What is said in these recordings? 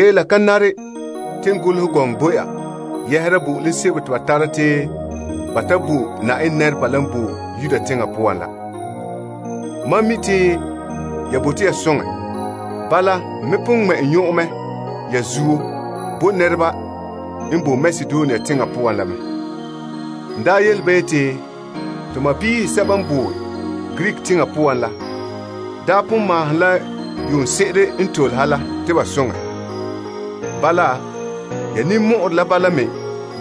La ka pakɛ te n golehɛ gɔŋɔ bo ya yɛhera bo'olom sebo te ba tara te ba ta bo Na'ayenɛ nɛreba la n boe Yuda teŋa poan la. Mam mi' te ya bote ya soŋɛ. Bala n me pon ŋmɛ' n nyɔn'ɔn mɛ ya zuo bo nɛresɛba n boe Makedonia teŋa poan la mɛ. N daa yele ba yeti, To sɔɔnrɔ sɛba n boe Greek teŋa poan la, daa pon maahom la yuunse'ere n tole ha la te ba soŋɛ. Bala, ya ninmɔ'ɔrɛ la bala me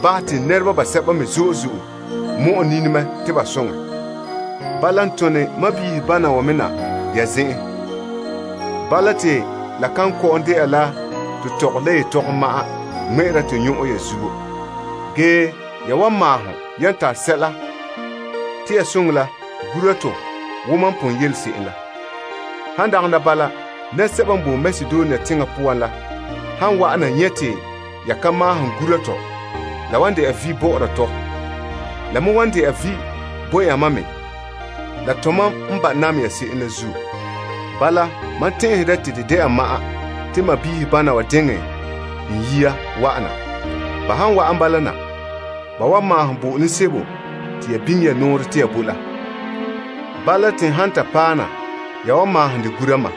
bahɛ te nɛra basɛba me zo'e zo'e mɔ'ɛ nini mɛ te ba soŋɛ. Bala, n tone to sɔɔnrɔ wa me na ya zen'en. Bala te la kan kɔ'ɔn dɛna la to tɔgɔre la yetɔgom ma'an ŋmɛ'ɛra to nyɔn'ɔn ya zuo. Ge ya wan maahom yan tare sɛla te ya soŋɛ la gura to wo mam pon yele se'em la. Han dagana bala nɛresɛba n boe Makedonia teŋa poan la han wa'ana nyɛ te ya ka maahom gura to, la wan dɛna vi' bɔ'ɔra tɔ. La me wan dɛna vi' bo yamam me la tomam n ba' nam ya se'em la zuo. Bala, mam tɛn'ɛhɛ dɛ te de dɛna ma'an to sɔɔnrɔ wa diŋɛ n yia wa'ana. Ba han wa'an bala na, ba wan maahom bo'olom sebo te ya biŋe ya nɔɔrɛ te ya bo la. Bala, te n han ta paɛ na, ya wan maahom dɛ gura mam.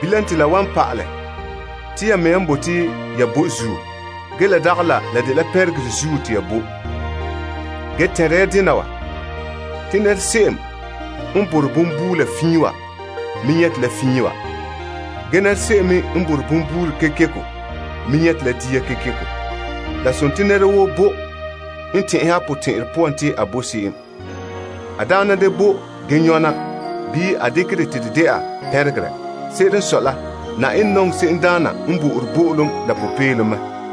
Bilam te la wan pa'alɛ te ya mea n bote te ya bo zuo, ge la dagɛ la la dela pɛnregerɛ zuo te ya bo. Ge tɛnre ya dena: te se'em n borɛ bonbuula fiin wa me nyɛte la dia fiin wa. Ge se'em me n borɛ bonbuula kekeko me nyɛte la dia kekeko. La nare te nɛra woo bo n tɛn'ɛhe a potɛn'ɛrɛ poan te a bo se'em. A daana da bo ge nyɔna bii a dekɛ dɛ te de dɛna pɛnregerɛ. Se'ere n sɔe la, Na'ayenɛ nɔŋɛ se'emdaana n bo'ore bo'olom la popeelom.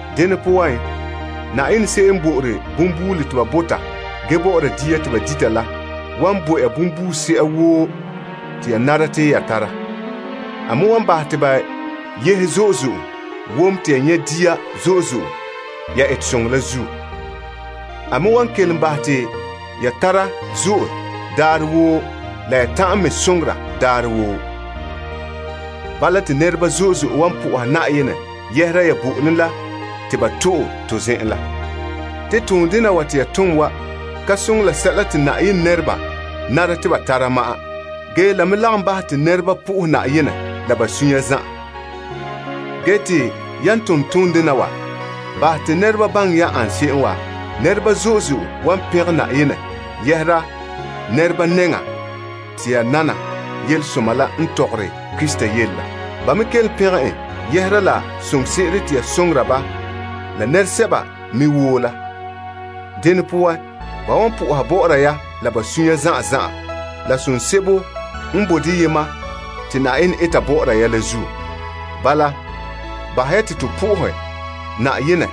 Dene poan, Na'ayenɛ se'em n bo'ore bonbuula te ba bota ge bɔ'ɔra dia te ba dita la wan bo ya bonbuuse'a woo te ya bɔta te ya tara. A me wan bahɛ te ba yehe zo'e wom te ya nyɛ' dia ya etesoŋɔ la zuo. A me wan kelom bahɛ ya te ya tara daarɛ woo la ya ta'an me soŋora daarɛ woo. Bala te nɛreba zo'e zo'e wan pɛngɛ Na'ayenɛ yɛhera ya bo'olom la te ba to'e to zen'en la. Te toon wa te ya tom wa soŋɛ la Na'ayenɛ nɛreba n nare te ba tara sɛla la, la me lagom bahɛ te nɛreba pɛngera Na'ayenɛ la ba sunya zan'an. Ge te yan tom toondena wa bahɛ te nɛreba baŋɛ ya ane se'em wa, nɛreba zo'e zo'e wan pɛngɛ Na'ayenɛ yɛhera nɛreba nɛŋan te ya nana Yelesoma la n tɔgɔre Krista yele la. Ba me kelom pɛngɛ en yɛhera la soŋore se'ere te ya soŋora ba la nɛresɛba me woo la. Dene poan, ba wan soha bɔ'ɔra ya la ba sunya zan'an zan'an la som sebo n bo deyema te Na'ayenɛ eta bɔ'ɔra ya la zuo. Bala, bahɛ ya te to bo Na'ayenɛ fara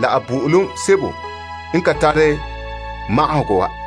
la a bo'olom sebo n ka tare magahegɔ wa.